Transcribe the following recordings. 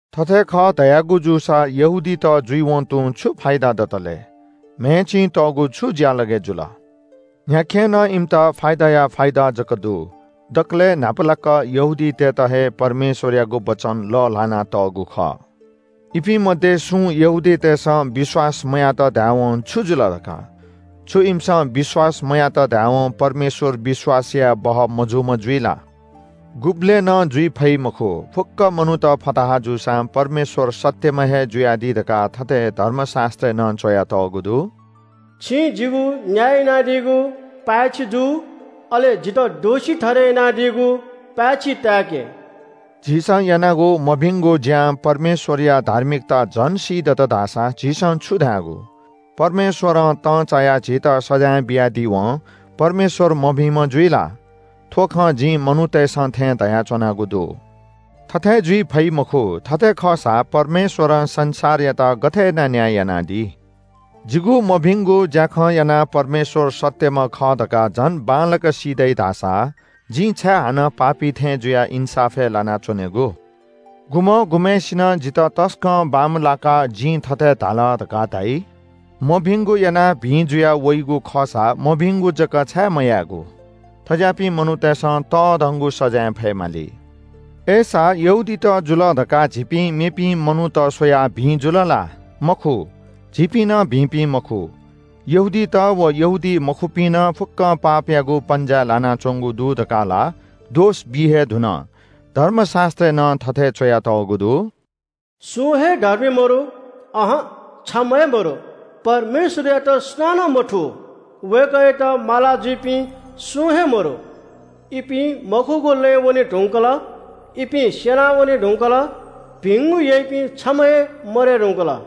थथे खः धयागु जूसा यहूदीत जुइवं तुं छु फाइदा दतलय्? म्‍हय् चिं तःगु छु ज्‍यालगय् जुल? न्‍ह्याखें नं इमित फाइदाया फाइदा जक दु। दकलय् न्‍हापालाक यहूदीतय्‌त हे परमेश्‍वरयागु वचन लः ल्‍हानातःगु खः। इपिं मध्‍ये सुं यहूदीतय्‌सं विश्‍वास मयात धायेवं छु जुल धकाः? छु इमिसं विश्‍वास मयात धायेवं परमेश्‍वर विश्‍वास यायेबहः मजूम्‍ह जुइ ला? गुबलें नं जुइ फइ मखु। फुक्‍क मनूत फताहा जूसां परमेश्‍वर सत्‍यम्‍ह हे जुयादी धकाः थथे धर्मशास्‍त्रय् नं च्‍वयातःगु दु – “छिं जिगु न्‍याय यानादीगु पाय्‌छि जू अले जितः दोषी ठहरय् यानादीगु पाय्‌छि ताय्‌के।” झीसं यानागु मभिंगु ज्‍यां परमेश्‍वरया धार्मिकता झन सीदत धाःसा झीसं छु धायेगु? परमेश्‍वरं तंचायाः झीत सजाँय बियादीवं परमेश्‍वर मभिंम्‍ह जुइ ला? (थ्‍व खँ जिं मनूतय्‌सं थें धयाच्‍वनागु दु।) थथे जुइ फइ मखु। थथे खःसा परमेश्‍वरं संसारयात गथे यानाः न्‍याय यानादी? जिगु मभिंगु ज्‍याखं यानाः परमेश्‍वर सत्‍यम्‍ह खः धकाः झन बांलाक सी दइ धाःसा जिं छाय् हानं पापी थें जुयाः इन्‍साफय् लानाच्‍वनेगु? गुम्‍हं गुम्‍हय्‌सिनं जितः तसकं बांमलाकाः जिं थथे धाल धकाः धाइ – “मभिंगु यानाः भिं जुया वइगु खःसा मभिंगु जक छाय् मयायेगु?” थज्‍याःपिं मनूतय्‌सं तःधंगु सजाँय फयेमाली। अय्‌सा यहूदीत जुल धकाः झीपिं मेपिं मनूत स्‍वयाः भिं जुल ला? मखु, झीपिं नं भिंपिं मखु। यहूदीत व यहूदीमखुपिं नं फुक्‍कं पापयागु पन्‍जाय् लानाच्‍वंगु दु धकाः ला दोष बी हे धुन। धर्मशास्‍त्रय् नं थथे च्‍वयातःगु दु – “सुं हे धर्मी मदु, अहं, छम्‍ह हे मदु। परमेश्‍वरयात सुनानं मथू, वय्‌कःयात मालाजुइपिं सुं हे मदु। इपिं मखुगु लँय् वने धुंकल, इपिं स्‍यनावने धुंकल। भिंगु याइपिं छम्‍ह हे मदये धुंकल।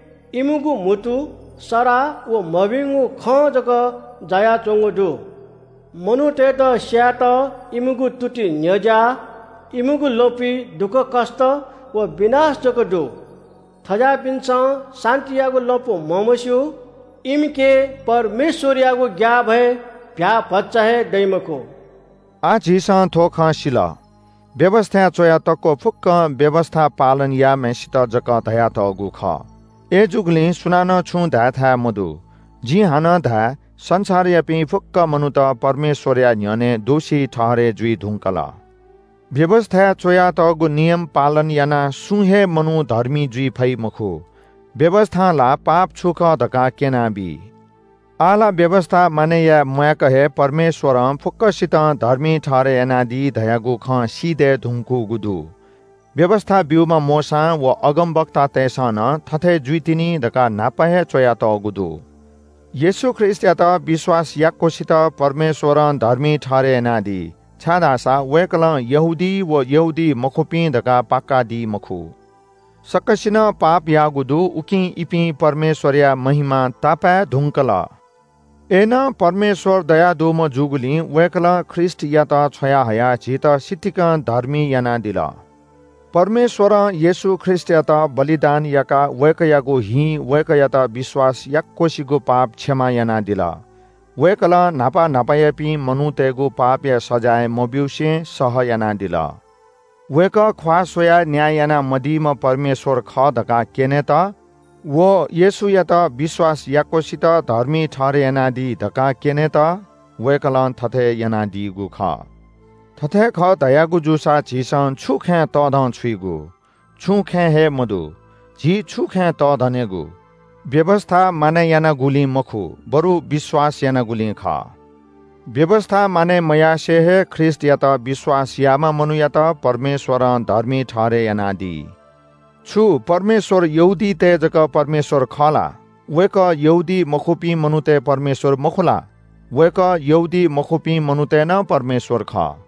इमिगु म्‍हुतु सराः व मभिंगु खं जक जायाच्‍वंगु दु। मनूतय्‌त स्‍यायेत इमिगु तुति न्‍ह्यज्‍याः। इमिगु लँपुइ दुःखकष्‍ट व विनाश जक दु। थज्‍याःपिन्‍सं शान्‍तियागु लँपु म्‍हमस्‍यू। इमिके परमेश्‍वरयागु ग्‍याःभय भ्‍याःभचा हे दइ मखु।” आः झीसं थ्‍व खँ सिल, व्‍यवस्‍थाय् च्‍वया तक्‍व फुक्‍कं व्‍यवस्‍था पालन याःम्‍हय्‌सित जक धयातःगु खः। अय्‌जूगुलिं सुनानं छुं धाय्‌थाय् मदु। जिं हानं धाये – संसारयापिं फुक्‍क मनूत परमेश्‍वरया न्‍ह्यःने दोषी ठहरय् जुइ धुंकल। व्‍यवस्‍थाय् च्‍वयातःगु नियम पालन यानाः सुं हे मनू धर्मी जुइ फइ मखु। व्‍यवस्‍थां ला पाप छु खः धकाः क्‍यनाबी। आः ला व्‍यवस्‍था मानय् याये म्‍वाय्‌क हे परमेश्‍वरं फुक्‍कसितं धर्मी ठहरय् यानादी धयागु खँ सी दये धुंकूगु दु। व्‍यवस्‍था ब्‍यूम्‍ह मोशां व अगमवक्तातय्‌सं नं थथे जुइतिनि धकाः न्‍हापा हे च्‍वयातःगु दु। येशू ख्रीष्‍टयात विश्‍वास याक्‍वसित परमेश्‍वरं धर्मी ठहरय् यानादी, छाय्‌धाःसा वय्‌कलं यहूदी व यहूदीमखुपिं धकाः पाकादी मखु। सकसिनं पाप याःगु दु, उकिं इपिं परमेश्‍वरया महिमां तापाय् धुंकल। अय्‌नं परमेश्‍वर दयादुम्‍ह जूगुलिं वय्‌कलं ख्रीष्‍टयात छ्वयाहयाः झीत सितिकं धर्मी यानादिल। परमेश्‍वरं येशू ख्रीष्‍टयात प्रायश्‍चितया बलिदान याकाः वय्‌कःयागु हिं वय्‌कःयात विश्‍वास याक्‍वसिगु पाप क्षमा यानादिल। वय्‌कलं न्‍हापा न्‍हापायापिं मनूतय्‌गु पापया सजाँय मब्‍यूसे सह यानादिल। वय्‌कः ख्‍वाः स्‍वयाः न्‍याय यानामदीम्‍ह परमेश्‍वर खः धकाः क्‍यनेत व येशूयात विश्‍वास याक्‍वसित धर्मी ठहरय् यानादी धकाः क्‍यनेत वय्‌कलं थथे यानादीगु खः। थथे खः धयागु जूसा झीसं छु खँय् तःधंछुइगु? छुं खँय् हे मदु। झी छु खँय् तःधनेगु? व्‍यवस्‍था मानय् यानागुलिं मखु, बरु विश्‍वास यानागुलिं खः। व्‍यवस्‍था मानय् मयासें हे ख्रीष्‍टयात विश्‍वास याःम्‍ह मनूयात परमेश्‍वरं धर्मी ठहरय् यानादी। छु परमेश्‍वर यहूदीतय् जक परमेश्‍वर खः ला? वय्‌कः यहूदीमखुपिं मनूतय् परमेश्‍वर मखु ला? वय्‌कः यहूदीमखुपिं मनूतय् नं परमेश्‍वर खः।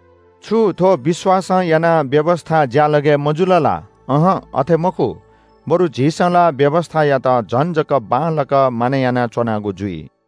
छु थ्‍व विश्‍वासं यानाः व्‍यवस्‍था ज्‍यालगय् मजुल ला? अहं, अथे मखु, बरु झीसं ला व्‍यवस्‍थायात झन जक बांलाक मानय् यानाच्‍वनागु जुइ।